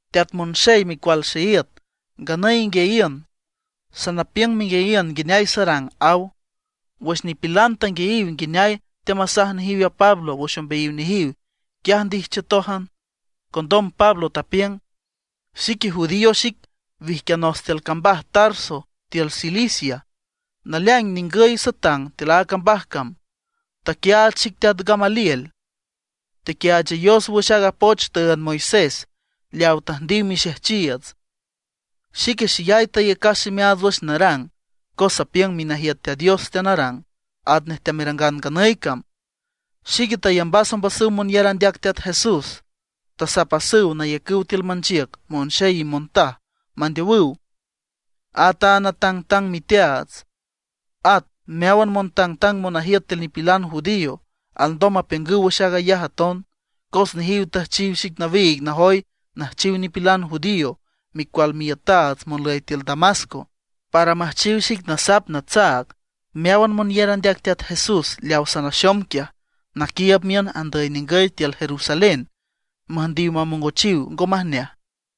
―Teat monxey micual xeíüt, nganüy inguiayiün, sanapiüng menguiayiün nguineay sarang ―aw. Wüx nipilan tanguiayiw nguineay teamasaj nejiw a Pablo wüx ombeayiw nejiw, quiaj ndijchiütójan. Condom Pablo tapiüng: ―Xique judío xic, wijquianos tiül cambaj Tarso, tiül Cilicia. Naleaing ningüy satang tiül a cambaj cam, taquiaach xic teat Gamaliel. Tequiaachayos wüx aaga poch tüünd Moisés, leaw tüjndiw mixejchiiüts. Xique xeyay tayacas ximeaats wüx narang, cos sapiüng minajiüt Teat Dios teanarang, atnej teamerangan nganüy cam. Xique tayambas ombasüw monyar andeac Teat Jesús. Tasapasüw nayacüw tiül manchiüc monxey y montaj, mandeowüw. At a natangtang miteaats, at meáwan montangtang monajiüt tiül nipilan judío, alndom mapiüngüw wüx aag ayaj aton. Cos nejiw tüjchiw xic nawiig najoy nüjchiw nipilan judío micual miiütaats monlüy tiül Damasco, para müjchiw xic nasap natsaag meáwan monyar andeac Teat Jesús leaw sanaxom quiaj, naquiiüb miün andüy ningüy tiül Jerusalén, müjndiw mamongochiw ngo majneaj.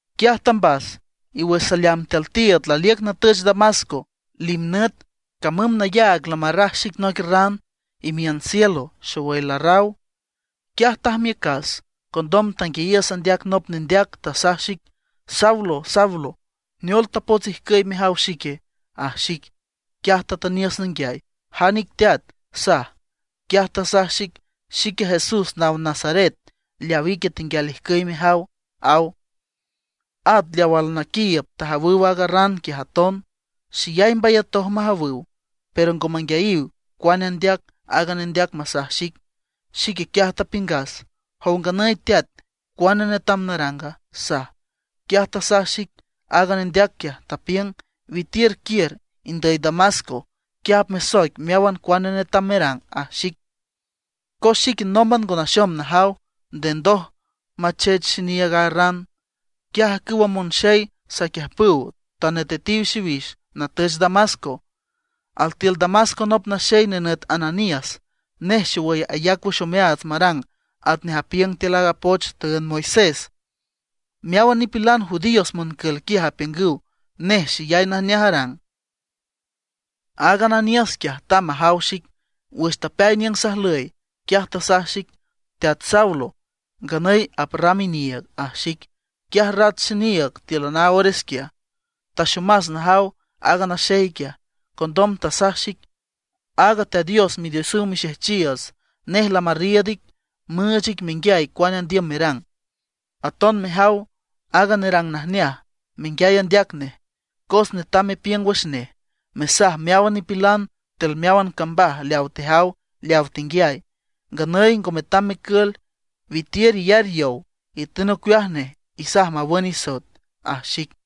’Quiaj tambas, y wüx saleamb tiül tiiüd laliüc natüch Damasco, limnüt camüm nayaag lamarraj xic noic ran imiün cielo, xowüy larraw. Quiaj tajmiücas. Condom tanguiayiüs andeac nop nendeac, tasaj xic: “Saulo, Saulo, ¿neol tapots ijcüy mejaw xique?” aj xic. Quiaj tatüniüs nanguiay: “¿Jan ic Teat?” saj. Quiaj tasaj xic: “Xique Jesús naw Nazaret, leaw ique tenguial ijcüy mejaw”, aw. At leaw alnaquiiüb tajawüw aaga ran quiaj aton, xeyay mbayatoj majawüw; pero ngo manguiayiw cuane andeac aaga nendeac masaj xic. Xique quiaj tapiüngas: “¿Jow nganüy Teat, cuane netam naranga?” saj. Quiaj tasaj xic aaga nendeac quiaj, tapiüng: “Witiür, quiür indüy Damasco. Quiaj apmesoic meáwan cuane netam merang”, aj xic. Cos xique nómban ngo naxom najaw, nde ndoj machech xiniiüg aaga ran. Quiaj ajcüwa monxey saquiüjpüw, tanetetiw xiwix natüch Damasco. ’Altiül Damasco nop naxey nenüt Ananías, nej xowüy ayac wüx omeaats marang atnej apiüng tiül aaga poch tüünd Moisés. Meáwan nipilan judíos moncül quiaj apiüngüw nej xeyay najneaj arang. Aaga Ananías quiaj, tamb majaw xic. Wüx tapeay niüng sajlüy, quiaj tasaj xic: “Teat Saulo, nganüy aprram iniiüg”, aj xic. Quiaj rat xiniiüg tíülan a ores quiaj, taxomas najaw aaga naxey quiaj. Condom tasaj xic: “Aaga Teat Dios Midiosüw mixejchiiüts, nej lamarriiüd ic, müüch ic menguiay cuane andiüm merang, aton mejaw aaga nerang najneaj, menguiay andeac nej. Cos netam mepiüng wüx nej, mesaj meáwan nipilan tiül meáwan cambaj leaw tejaw leaw tenguiay. Nganüy ngo metam mecül, witiür iyar yow, itün ocueaj nej, isaj mawün isoet”, aj xic.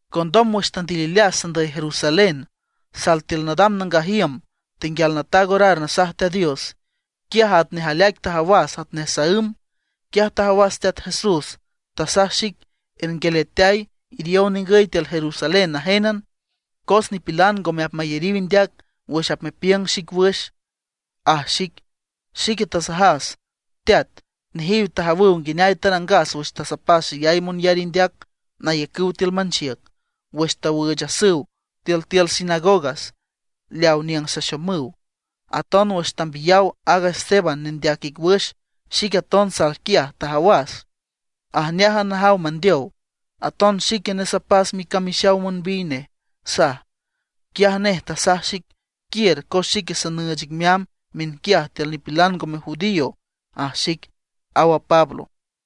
’Condom wüx tandilileas sandüy Jerusalén, sal tiül nadam nangaj iüm tenguial nataag orar nasaj Teat Dios, quiaj atnej aleaic tajawas atnej saǘm. Quiaj tajawas a Teat Jesús, tasaj xic: “Ernguialeateay, iriow ningüy tiül Jerusalén najénan. Cos nipilan ngome apmayariw indeac wüx apmepiüng xic wüx”, aj xic. Xique tasajas: “Teat, nejiw tajawüw nguineay tarangas wüx tasapas xeyay monyar indeac nayacüw tiül manchiüc, wüx tawüüchasüw tiültiül sinagogas leaw niüng saxomüw. Aton wüx tambiyaw aaga Esteban nendeac ic wüx, xique aton sal quiaj, tajawas, ajneájan najaw mandeow, aton xique nesapas micamixaw monbiy nej”, saj. Quiaj nej tasaj xic: “Quiür, cos xique sanüüch ic meamb miünquiaj tiül nipilan ngome judío”, aj xic ―aw a Pablo.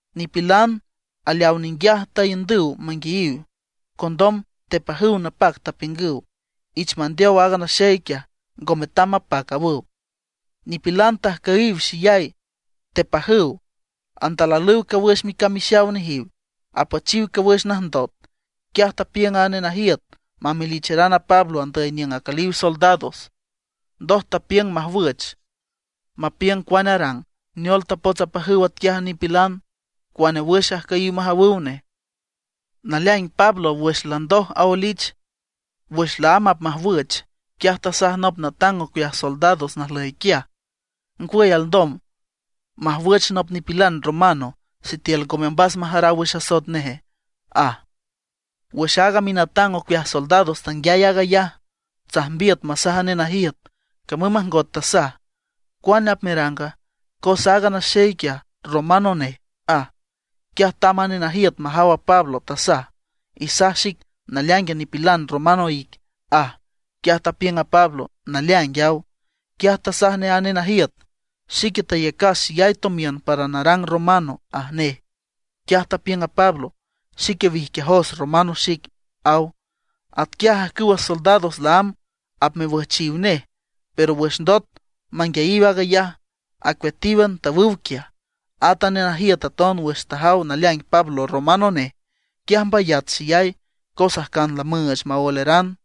Nipilan aleaw ninguiaj taiündüw manguiayiw. Condom tepajüw napac, tapiüngüw: ―¡Ich mandeow aaga naxey quiaj; ngo metam mapac! ―awüw. Nipilan tajcüyiw xeyay, tepajüw, andalalüw cawüx micamixaw nejiw, apüchiw cawüx najndot. Quiaj tapiüng a nenajiüt mamelicharan a Pablo andüy niüng acüliw soldados. Ndoj tapiüng majwüch, mapiüng cuane arang, neol tapots apajüw atquiaj a nipilan, cuane wüx ajcüyiw majawüw nej. Naleaing Pablo wüx landoj aoelich, wüx laámb apmajwüch, quiaj tasaj nop natang ocueaj soldados najlüy quiaj: ―¿Ngwüy, alndom majwüch nop nipilan romano, sitiül ngome ombas majaraw wüx asoet neje? ―aj. Wüx aaga minatang ocueaj soldados tanguiay aag ayaj, tsajmbiüt masaj a nenajiüt, camüm majngot tasaj: ―¿Cuane apmeranga? Cos aaga naxey quiaj romano nej ―aj. Quiaj tamb a nenajiüt majaw a Pablo, tasaj: ―Isaj xic, ¿naleaingue, nipilan romano ique? ―aj. Quiaj tapiüng a Pablo: ―Naleaing ―aw. Quiaj tasaj nej a nenajiüt: ―Xique tayacas xeyay tomiün para narang romano ―aj nej. Quiaj tapiüng a Pablo: ―Xique wijquiajos romano xic ―aw. Atquiaj ajcüwa soldados laámb apmewüjchiw nej, pero wüx ndot manguiayiw aag ayaj, acueatíwan tawüw quiaj. At a nenajiüt aton wüx tajaw naleaing Pablo romano nej, quiaj mbayat xeyay, cos ajcan lamüüch maoeleran.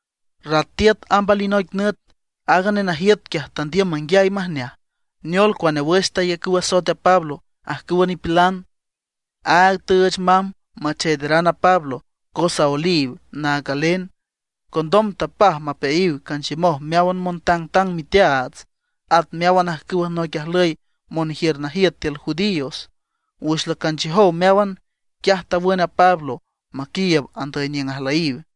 Rat tiüt amb alinoic nüt, aaga nenajiüt quiaj tandiüm manguiay majneaj, neol cuane wüx tayacüw asoet a Pablo ajcüwa nipilan. Áag tüüch mamb macheederan a Pablo, cos aoeliw naag galen. Condom tapaj mapeayiw canchiümoj meáwan montangtang miteaats, at meáwan ajcüwa noic ajlüy monjiür najiüt tiül judíos. Wüx lacanchiüjow meáwan, quiaj tawün a Pablo maquiiüb andüy niüng ajlüyiw.